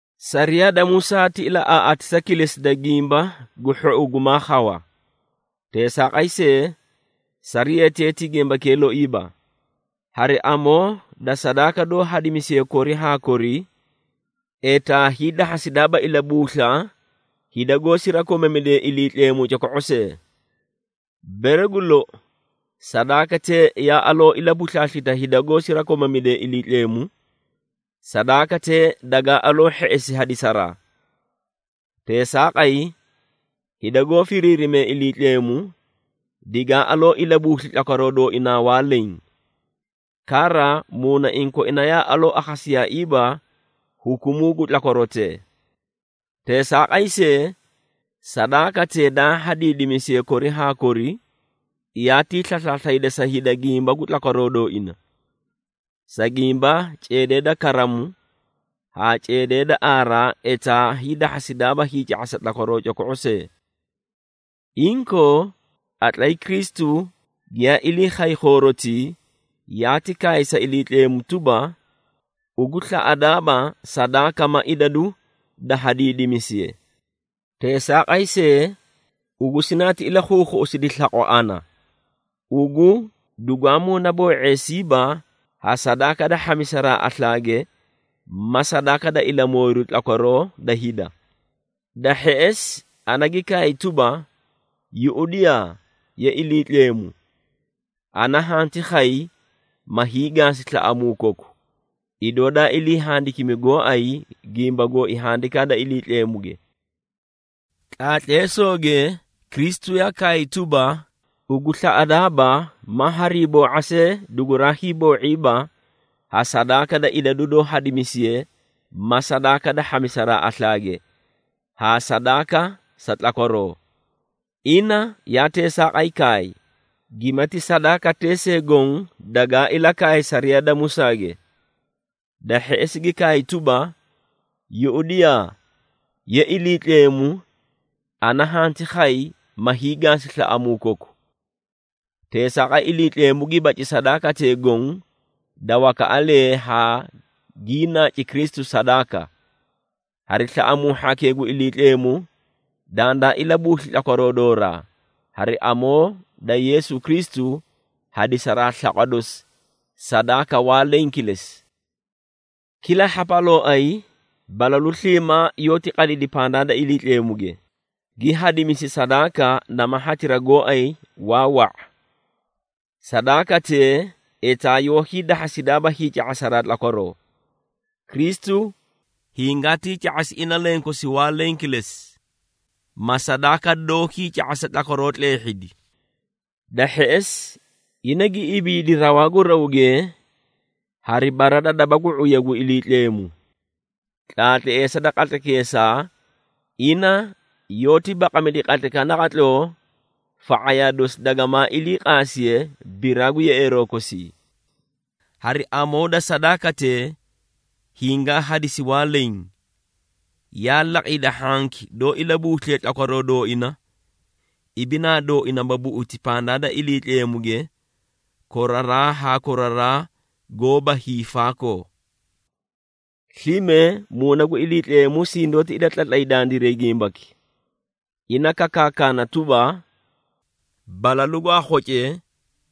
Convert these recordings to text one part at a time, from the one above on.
Sariyaa da Musaa ti ilaꞌaaꞌaatisa kilesi da gimba gu hhou gumaa khawa. Teesaaqay see, sariyatee ti gimbakee loiiba. Hari amoo da sadaaka doó hadimisiye kori haa kori, etaa hiidahhasidaaba ilabuusla hida goó sirakomamidee Iliitleemu coko⁄o see. Bere gu lou, sadaakatee yaa aloo ilabuslaaslita hida goó sirakomamidee Iliitleemu, sadaakatee dagaa aloo hheꞌesi hadisaraa. Teesaaqay, hida goó firiirimee Iliitleemu, digaa aloo ilabuusli tlakwaroo dooinaa waa leẽ. Kara, muunaiĩ koina yaa aloo akhasiyaaiiba hukumuu gu tlakwarotee. Teesaaqay see, sadaakatee daa hadiidimisiye kori haa kori, yaatii slaslaaslayda sa hida gimba gu tlakwaroo dooina. Sa gimba, ceedee da karamu haa ceedee da aaraa etaa hiidahhasidaaba hiica⁄asa tlakwaroo coko⁄o see. Inkoo, qatlay Kristu giyaa ilii khay khoorotii, yaati kaay sa Iliitleemu tuba, “Ugu slaꞌadaaba sadaaka ma idadu daa hadiidimisiye. Teesaaqay see, ugu sinaati ilakhuukhuꞌusidi slaqwa ana. Ugu dugwaa muunaboo⁄eesiiba ha sadaaka da hhamisaraa aslaage ma sadaaka da ilamooyiru tlakwaroo da hida. Da hheꞌesi, ana gi kaay tuba, ‘Yuꞌudiyaa! Ye Iliitleemu, ana hanti khay, ma hiigaasi slaꞌamuu koku, idoo daa ilii handikimi gooay gimba gooi Handikaa da Iliitleemuge.’” Tlaatleesooge Kristu yaa kaay tuba, “Ugu slaꞌadaaba ma hariiboo⁄a see duguraa hiiboo⁄iiba ha sadaaka da idadu doó hadimisiye ma sadaaka da hhamisaraa aslaage, haa sadaaka sa tlakwaroo.” Ina yaa teesaaqay kaay, gimati sadaakatee see goõ dagaa ilakaay sariyaa da Musaage. Da hheꞌesi, gi kaay tuba, “Yuꞌudiyaa! Ye Iliitleemu, ana hanti khay, ma hiigaasi slaꞌamuu koku.” Teesaaqay, Iliitleemu gi baci sadaakatee goõ da wakaꞌalee haa gii naaci Kristu sadaaka. Hari slaꞌamuu hhakee gu Iliitleemu dandaa ilabuusli tlakwaroo dooraa, hari amoo da Yeesu Kristu hadisaraa slaqwa dosi sadaaka da waa leẽ kilesi. Kila hhapalooay, balalu sliimaa yoóti qadidi pandaa da Iliitleemuge, gi hadimisi sadaaka nama hatira gooay waa wa⁄a. Sadaakatee etaa yoó hiidahhasidaaba hiica⁄asa tlakwaroo. Kristu hingaatii ca⁄asi ina lenkosi waa leẽ kilesi, ma sadaaka doó hiica⁄asa tlakwaroo tleehhidi. Da hheꞌesi, ina gi ibiidi rawaa gu rawge hari bara da daba gu ⁄uya gu Iliitleemu. Tlaatleesa da qatlaykeesaa, ina yoóti baqamidi qatlaykaꞌa naqatloo fa⁄ayaa dosi dagamaa ilii qaasiye biraa gu yeꞌeeroo kosii. Hari amoo da sadaakatee hingaa hadisi waa leẽ, yaa laqi hida hhanki doó ilabuusliye tlakwaroo dooina, ibinaa dooina ma buꞌuti pandaa da Iliitleemuge, koraraa haa koraraa goóba hiifaakoo. Slime, Muuna gu Iliitleemu sindoóti ilatlay dandiray gimbaki. Ina kakaakana tuba, “Balalu gwaa khocee,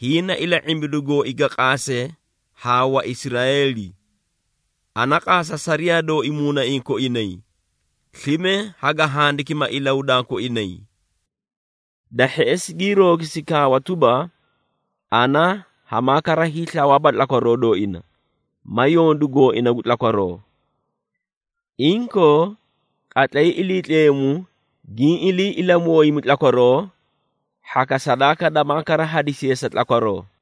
hiĩ na ila⁄imbidu gooi ga qaase haa Waisraeeli. Ana qaasa sariyaa dooi muunaiĩ koinay, slime haga handikima ilahudaa koinay.” Da hheꞌesi gii roogisi kaawa tuba, “Ana hamaa kara hiislawaaba tlakwaroo dooina, ma yondu gooina gu tlakwaroo.” Inkoo, qatlay Iliitleemu giĩ ilii ilamooyimi tlakwaroo, hhaka sadaaka damaa kara hadisiye sa tlakwaroo.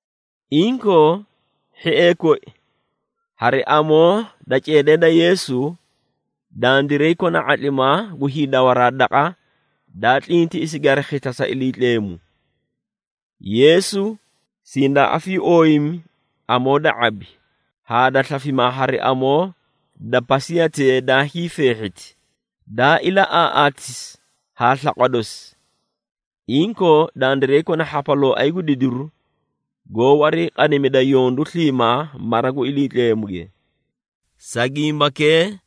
Inkoo, hhiee koi, hari amoo da ceedee da Yeesu, dandiray kona ⁄atlimaa gu hiidawaraa Daqa daa Tlintiꞌisige Hari Khisla sa Iliitleemu. Yeesu sindaa afiiooyimi amoo da ⁄abi haa da slafimaa hari amoo da pasiyatee daa hiifeehhiti, daa ilaꞌaaꞌaatisi haa slaqwa dosi. Inkoo, dandiray kona hhapalooay gu didiru goó wariiqadimida yondu sliimaa mara gu Iliitleemuge. Sa gimbakee,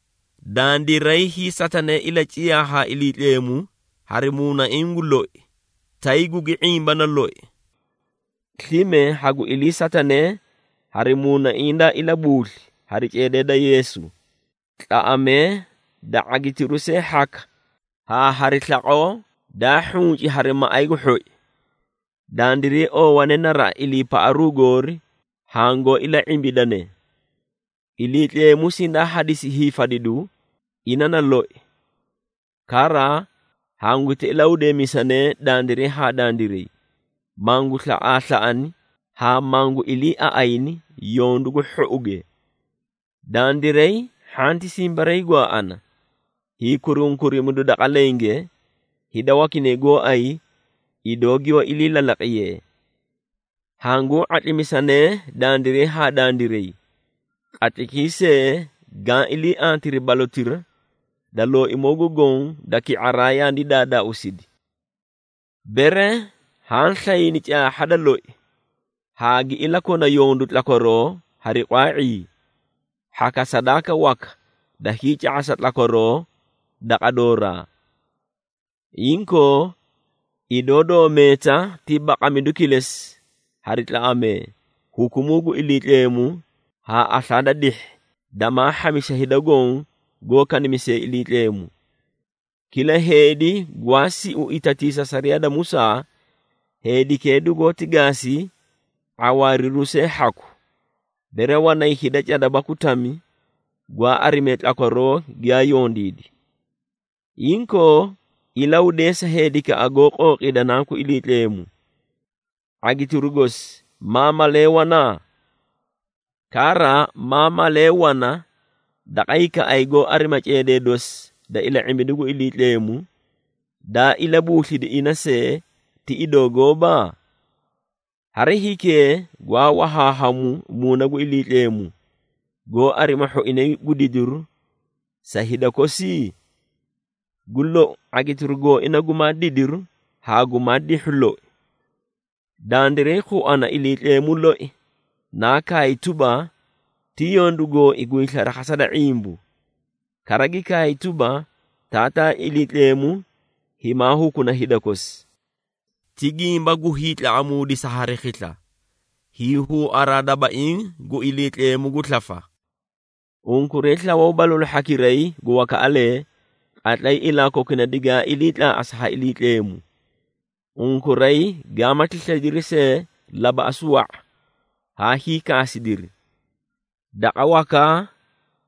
dandiray hiisatanee ilaciyaa haa Iliitleemu hari muunaiĩ gu loi, tay gugi ⁄imbana loi. Slime hagu iliisatanee hari muunaiĩ daa ilabuusli hari ceedee da Yeesu, tlaꞌamee da ⁄agitiru see hhaka haa hari slaqoo daa hhunci hari maꞌay gu hhoi. Dandiray oowane naraꞌa iliipaꞌaru goori hangoó ila⁄imbidane. Iliitleemu sindaa hadisi hiifadidu, ina na loi. Kara, hanguti ilahudeemisanee dandiray haa dandiray, mangu slaꞌaaslaꞌana haa mangu iliiaꞌayni yondu gu hhouge. Dandiray hhanti simbariigwaaꞌana hiikurunkurimidu daqa lenge, hida wakinay gooay idoo giyoó ilii lalaqiyee. Hanguu ⁄atlimisanee dandiray haa dandiray, qatlaykii see gaã ilii antiri balotira da Looimoo gu Goõ da ki⁄araa yaani daadaausidi. Bere haã slayni caahha da loi, haa gi ilakona yondu tlakwaroo hari qwaa⁄ii, hhaka sadaaka waka da hiica⁄asa tlakwaroo daqa dooraa. Inkoo, idoo doó meeta ti baqamidu kilesi hari tlaꞌamee, hukumuu gu Iliitleemu haa aslaa da dihhi damaa hhamisa hida goõ goó kanimisee Iliitleemu. Kila heedi gwaa siu itatiisa sariyaa da Musaa, heedikee dugoóti gaasi ⁄awaariru see hhaku, bere wanay hida cada baku tami gwaa arimee tlakwaroo giyaa yondiidi. Inkoo, ilahudeesa heedikaꞌa goó qooqiida Nanku Iliitleemu. ⁄agitiru gosi maa malee wana? Kara, maa malee wana daqa hikaꞌay goó arima ceedee dosi da ila⁄imbidu gu Iliitleemu, daa ilabuuslidi ina see ti idoo gooba? Hari hiikee gwaa wahaahamu Muuna gu Iliitleemu goó arima hhoinay gu didiru sa hida kosi? Gu lou ⁄agitiru gooina gumaa didiru haa gumaa dihhu loi. Dandiray khuana Iliitleemu loi naa kaay tuba, “Ti yondu gooi gu hiislarakhasa da ⁄imbu.” Kara gi kaay tuba, “Taataa Iliitleemu himaa hukuna hida kosi.” Ti gimba gu hiitlaꞌamuudisa hari khisla, hiihuuaraa dabaiĩ gu Iliitleemu gu slafa. Unkuray slawaw balalu hhakiray gu wakaꞌalee, qatlay ilaa kokuna digaa ilii tlaaꞌasi ha Iliitleemu. Unkuray gaamati slaydiri see labaꞌasu wa⁄a, haa hiikaasidiri. Daqa wakaa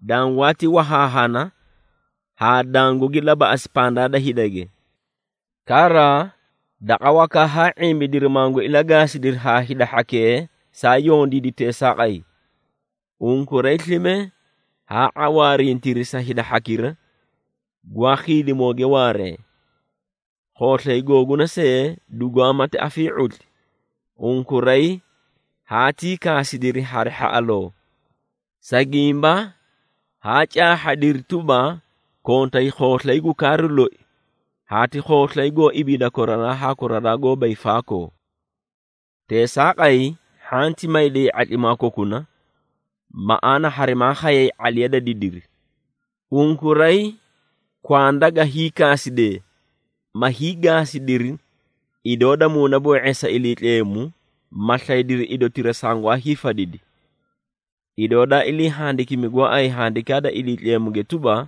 dangwaati wahaahana haa dangugi labaꞌasi pandaa da hidage. Kara daqa wakaa haa ⁄imbidiri mangu ilagaasidiri haa hida hhakee saa yondiidi teesaaqay. Unkuray slime haa ⁄awaarintiri sa hida hhakira gwaa khiidimooge waaree. Khooslay googuna see dugumaati afii⁄utli, unkuray haatii kaasidiri hari hhaꞌaloo, sa gimba haa caahhadiri tuba, kontay khooslay gu kaaru loi haa ti khooslay goó ibiida koraraa haa koraraa goóba hiifaakoo. Teesaaqay, hhanti mayday ⁄atlimaa kokuna, maꞌaana harimaa khayay ⁄aliya da didiri. Unkuray kwanda ga hiikaasidee, ma hiigaasidiri idoo da muunaboo⁄eesa Iliitleemu, ma slaydiri idotira sangwaa hiifadidi. Idoo daa ilii handikimi gooay Handikaa da Iliitleemuge tuba,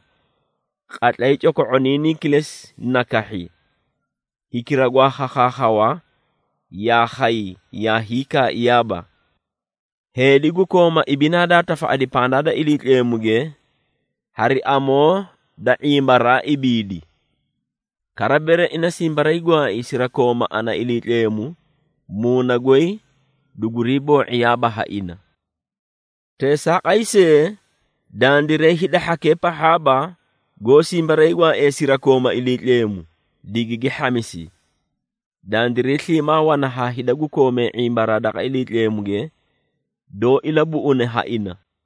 “Qatlay coko⁄oniinii kilesi na kahhi, hikira gwaa khakhaakhawa, yaa khay yaa hiikaaiyaaba. Heedi gu kooma ibinaa daa tafaꞌadi pandaa da Iliitleemuge, hari amoo da ⁄imbaraa ibiidi. Kara, bere ina simbariigwaai sirakooma ana Iliitleemu, muuna goy dugurii boo⁄iyaaba ha ina.” Teesaaqay see, dandiray hida hhakee pahhaaba goó simbariigwaaiye sirakooma Iliitleemu, digigi hhamisi. Dandiray sliimaa wana haa hida gu koomee ⁄imbaraa daqa Iliitleemuge, doó ilabuꞌune ha ina.